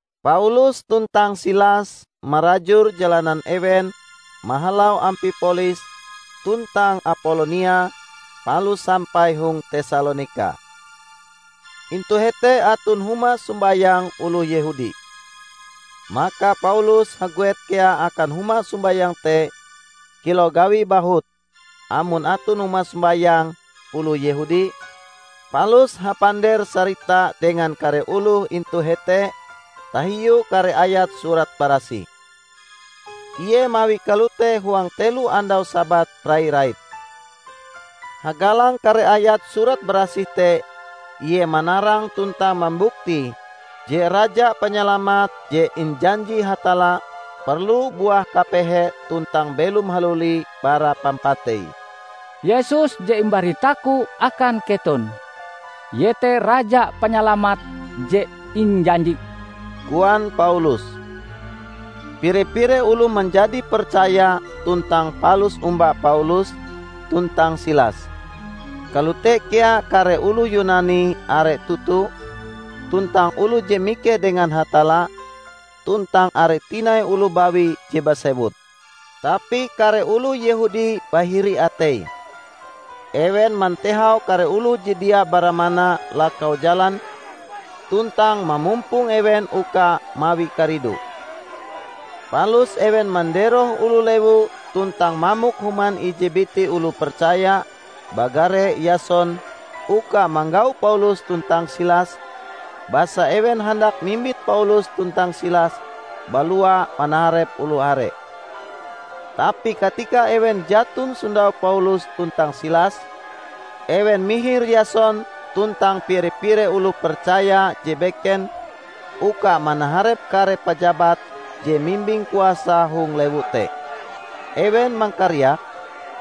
Paulus tuntang Silas marajur jalanan ewen mahalau Ampipolis tuntang Apolonia palus sampai hong Tesalonika. Intu hete aton huma sombayang oloh Yehudi. Maka Paulus haguet kea akan huma sombayang te kilau gawie bahut amon aton huma sombayang oloh Yehudi -- palus hapander-sarita dengan kare oloh intu hete tahiu kare ayat Surat Barasih. Ie mawie kalote huang telo andau Sabat rai-rait. Hagalang kare ayat Surat Barasih te Ie manarang tuntang mambuktie je Raja Panyalamat je injanji Hatalla perlu buah kapehe tuntang belom haluli bara pampatei. "Yesus je imbaritaku akan keton, Ie te Raja Panyalamat je injanji," koan Paulus. Pire-pire oloh manjadi percaya tuntang palus omba Paulus tuntang Silas; kalote kea kare oloh Yunani are toto, tuntang oloh je mikeh dengan Hatalla, tuntang are tinai oloh bawi je basewut. Tapi kare oloh Yehudi bahiri ateie. Ewen mantehau kare oloh je dia baramana lakau jalan tuntang mamumpong ewen uka mawi karidu. Palus ewen manderoh oloh lewu tuntang mamok human ije biti oloh percaya bagare Yason uka manggau Paulus tuntang Silas, basa ewen handak mimbit Paulus tuntang Silas balua manaharep oloh are. Tapi katika ewen jaton sondau Paulus tuntang Silas, ewen mihir Yason tuntang pire-pire oloh percaya je beken uka manaharep kare pajabat je mimbing kuasa hong lewu te. Ewen mangkariak,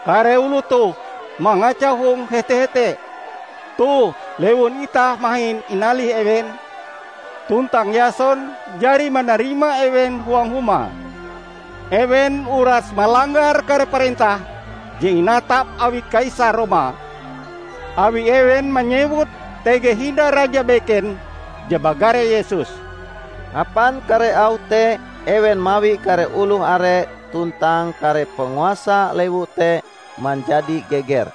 "Kare oloh toh mangacau hong hete-hete! Toh, lewun itah mahin inalih ewen, tuntang Yason jari manarima ewen huang humae. Ewen uras malanggar kare parentah je inatap awi Kaisar Roma, awi ewen manyewut tege hindai raja beken je bagare Yesus." Hapan kare auh te ewen mawi kare oloh are tuntang kare panguasa lewu te manjadi geger.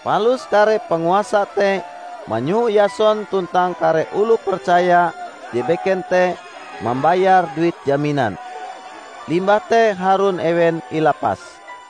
Palus kare panguasa te manyoho Yason tuntang kare oloh percaya je beken te mambayar duit jaminan. Limbah te harun ewen ilapas.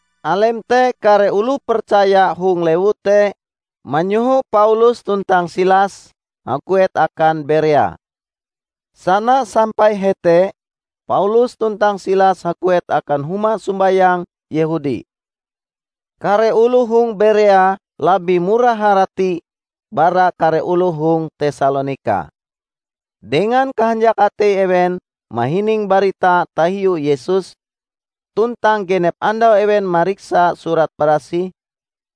Alem te kare oloh percaya hong lewu te manyoho Paulus tuntang Silas haguet akan Berea. Sana sampai hete, Paulus tuntang Silas haguet akan huma sombayang Yehudi. Kare oloh hong Berea labih murah harati bara kare oloh hong Tesalonika. Dengan kahanjak atei ewen mahining barita tahiu Yesus, tuntang genep andau ewen mariksa Surat Barasih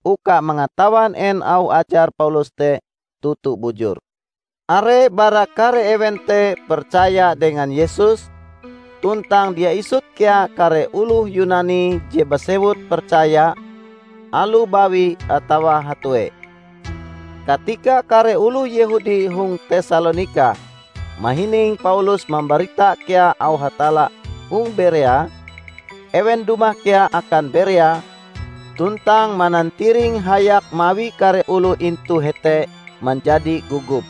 uka mangatawan en auh ajar Paulus te toto bujur. Are bara kare ewen te percaya dengan Yesus, tuntang dia isut kea kare oloh Yunani je basewut percaya; aloh bawi atawa hatue. Katika kare oloh Yehudi hong Tesalonika mahining Paulus mambarita kea auh Hatalla hong Berea, ewen dumah kea akan Berea tuntang manantiring hayak mawi kare oloh intu hete manjadi gogop.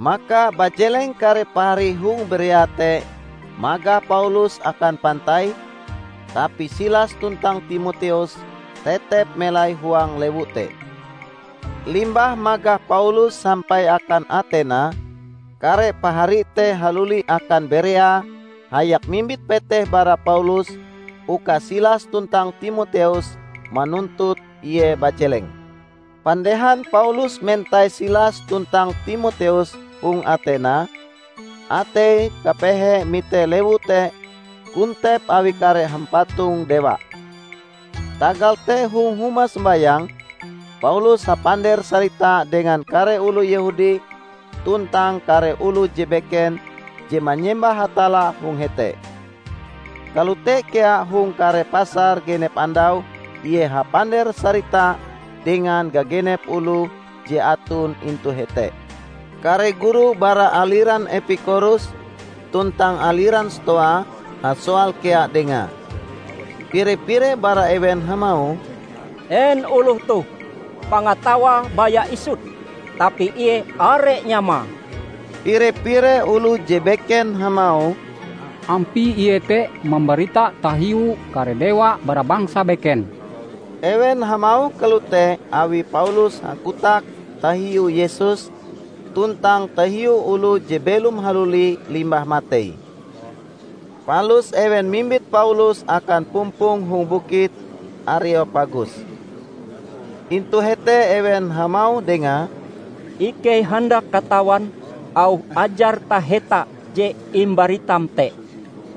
Maka bajeleng kare pahari hong Berea te magah Paulus akan pantai, tapi Silas tuntang Timoteus tetep melai huang lewu te. Limbah magah Paulus sampai akan Atena, kare pahari te haluli akan Berea hayak mimbit peteh bara Paulus uka Silas tuntang Timoteus manuntut ie bajeleng. Pandehan Paulus mentai Silas tuntang Timoteus hong Atena, ateie kapehe mite lewu te kontep awi kare hampatong dewa. Tagal te hong huma sombayang, Paulus hapander-sarita dengan kare oloh Yehudi tuntang kare oloh je beken je manyembah Hatalla hong hete. Kalote kea hong kare pasar genep andau ie hapander-sarita dengan gagenep oloh je aton intu hete. Kare guru bara aliran Epikorus tuntang aliran Stoa hasoal kea dengae. Pire-pire bara ewen hamauh, "En oloh toh? Pangatawae baya isut, tapi ie are nyamae!" Pire-pire oloh je beken hamauh, "Ampie ie te mambarita tahiu kare dewa bara bangsa beken." Ewen hamauh kalote awi Paulus hakotak tahiu Yesus tuntang tahiu oloh je belom haluli limbah matei. Palus ewen mimbit Paulus akan pumpong hong Bukit Areopagus. Intu hete ewen hamauh dengae, "Ikei handak katawan auh ajar taheta je imbaritam te.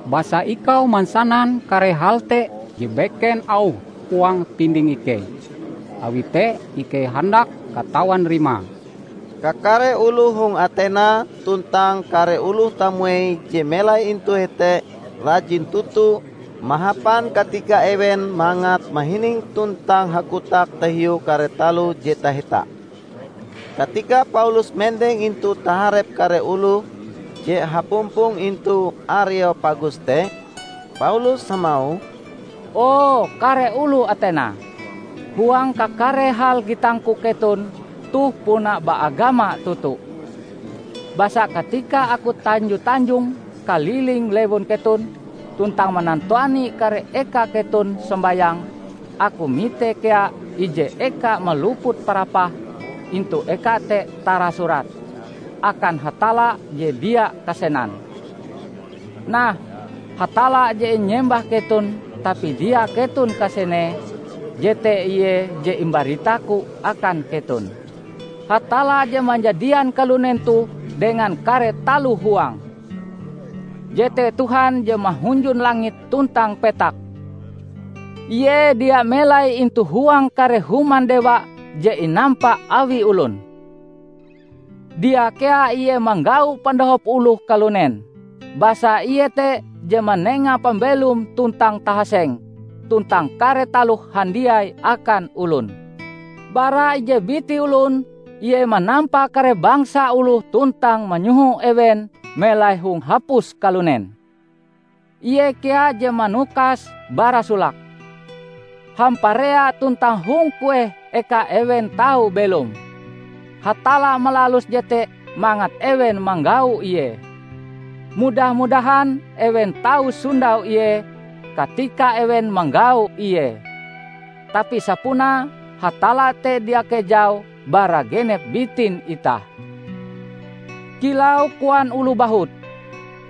Basa ikau mansanan kare hal te je beken auhe huang pinding ikei. Awi te ikei handak katawan rimae." ( Kakare oloh hong Atena tuntang kare oloh tamuei je melai intu hete rajin toto mahapan katika ewen mangat mahining tuntang hakotak tahiu kare taloh je taheta.) Katika Paulus mendeng intu taharep kare oloh je hapumpong intu Areopagus te, Paulus hamauh, "O kare oloh Atena! Huang kakare hal gitangku keton toh puna baagama toto. Basa katika aku tanjo-tanjong kaliling lewun keton tuntang manantuani kare eka keton sombayang, aku mite kea ije eka maluput parapah; intu eka te tarasurat, 'Akan Hatalla Je Dia Kasenan.' Nah, Hatalla je inyembah keton tapi dia keton kasenee, jete ie je imbaritaku akan keton. Hatalla je manjadian kalunen toh dengan kare taloh huange, jete Tuhan je mahunjun langit tuntang petak. Ie dia melai intu huang kare human dewa je inampa awi olon. Dia kea Ie manggau pandohop oloh kalunen, basa Ie te je manenga pambelom tuntang tahaseng tuntang kare taloh handiai akan olon. Bara ije biti olon Ie manampa kare bangsa oloh tuntang manyoho ewen melai hong hapus kalunen. Ie kea je manukase bara solake, hamparea tuntang hong kueh eka ewen tau belom. Hatalla malalus jete mangat ewen manggau Ie. Mudah-mudahan ewen tau sondau Ie katika ewen manggau Ie. Tapi sapunae Hatalla te dia kejau bara genep bitin itah. Kilau koan oloh bahut,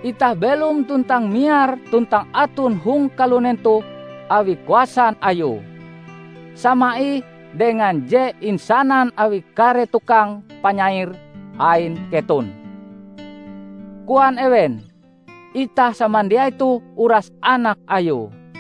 'Itah belom tuntang miar tuntang aton hong kalunen toh awi kuasan Ayue.' Sama ih dengan je insanan awi kare tukang panyair ain keton. Koan ewen, 'Itah samandiai toh uras anak Ayue.'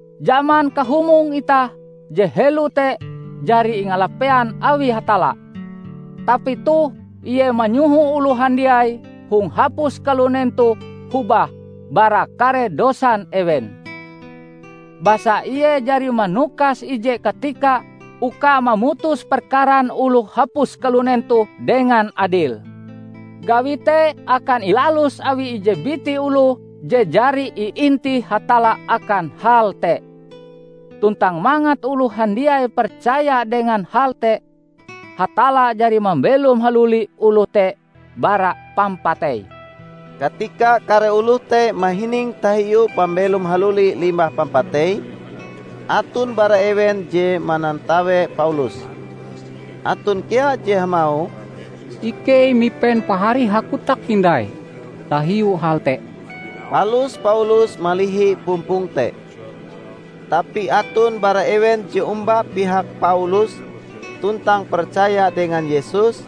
Jaman kahumong itah je helo te jari ingalapean awi Hatalla, tapi toh Ie manyoho oloh handiai hong hapus kalunen toh hobah bara kare dosan ewen. Basa Ie jari manukas ije katika uka mamutus perkaran oloh hapus kalunen toh dengan adil. Gawi te akan ilalus awi ije biti oloh je jari iintih Hatalla akan hal te. Tuntang mangat oloh handiai percaya dengan hal te, Hatalla jari mambelom haluli oloh te bara pampatei!" Katika kare oloh te mahining tahiu pambelom haluli limbah pampatei, aton bara ewen je manantawe Paulus. Aton kea je hamauh, "Ikei mipen pahari hakotak hindai tahiu hal te." Palus Paulus malihi pumpong te. Tapi aton bara ewen je omba pihak Paulus tuntang percaya dengan Yesus,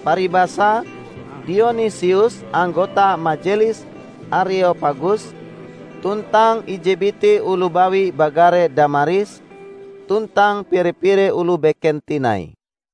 paribasae: Dionisius anggota majelis Areopagus, tuntang ije biti oloh bawi bagare Damaris, tuntang pire-pire oloh beken tinai.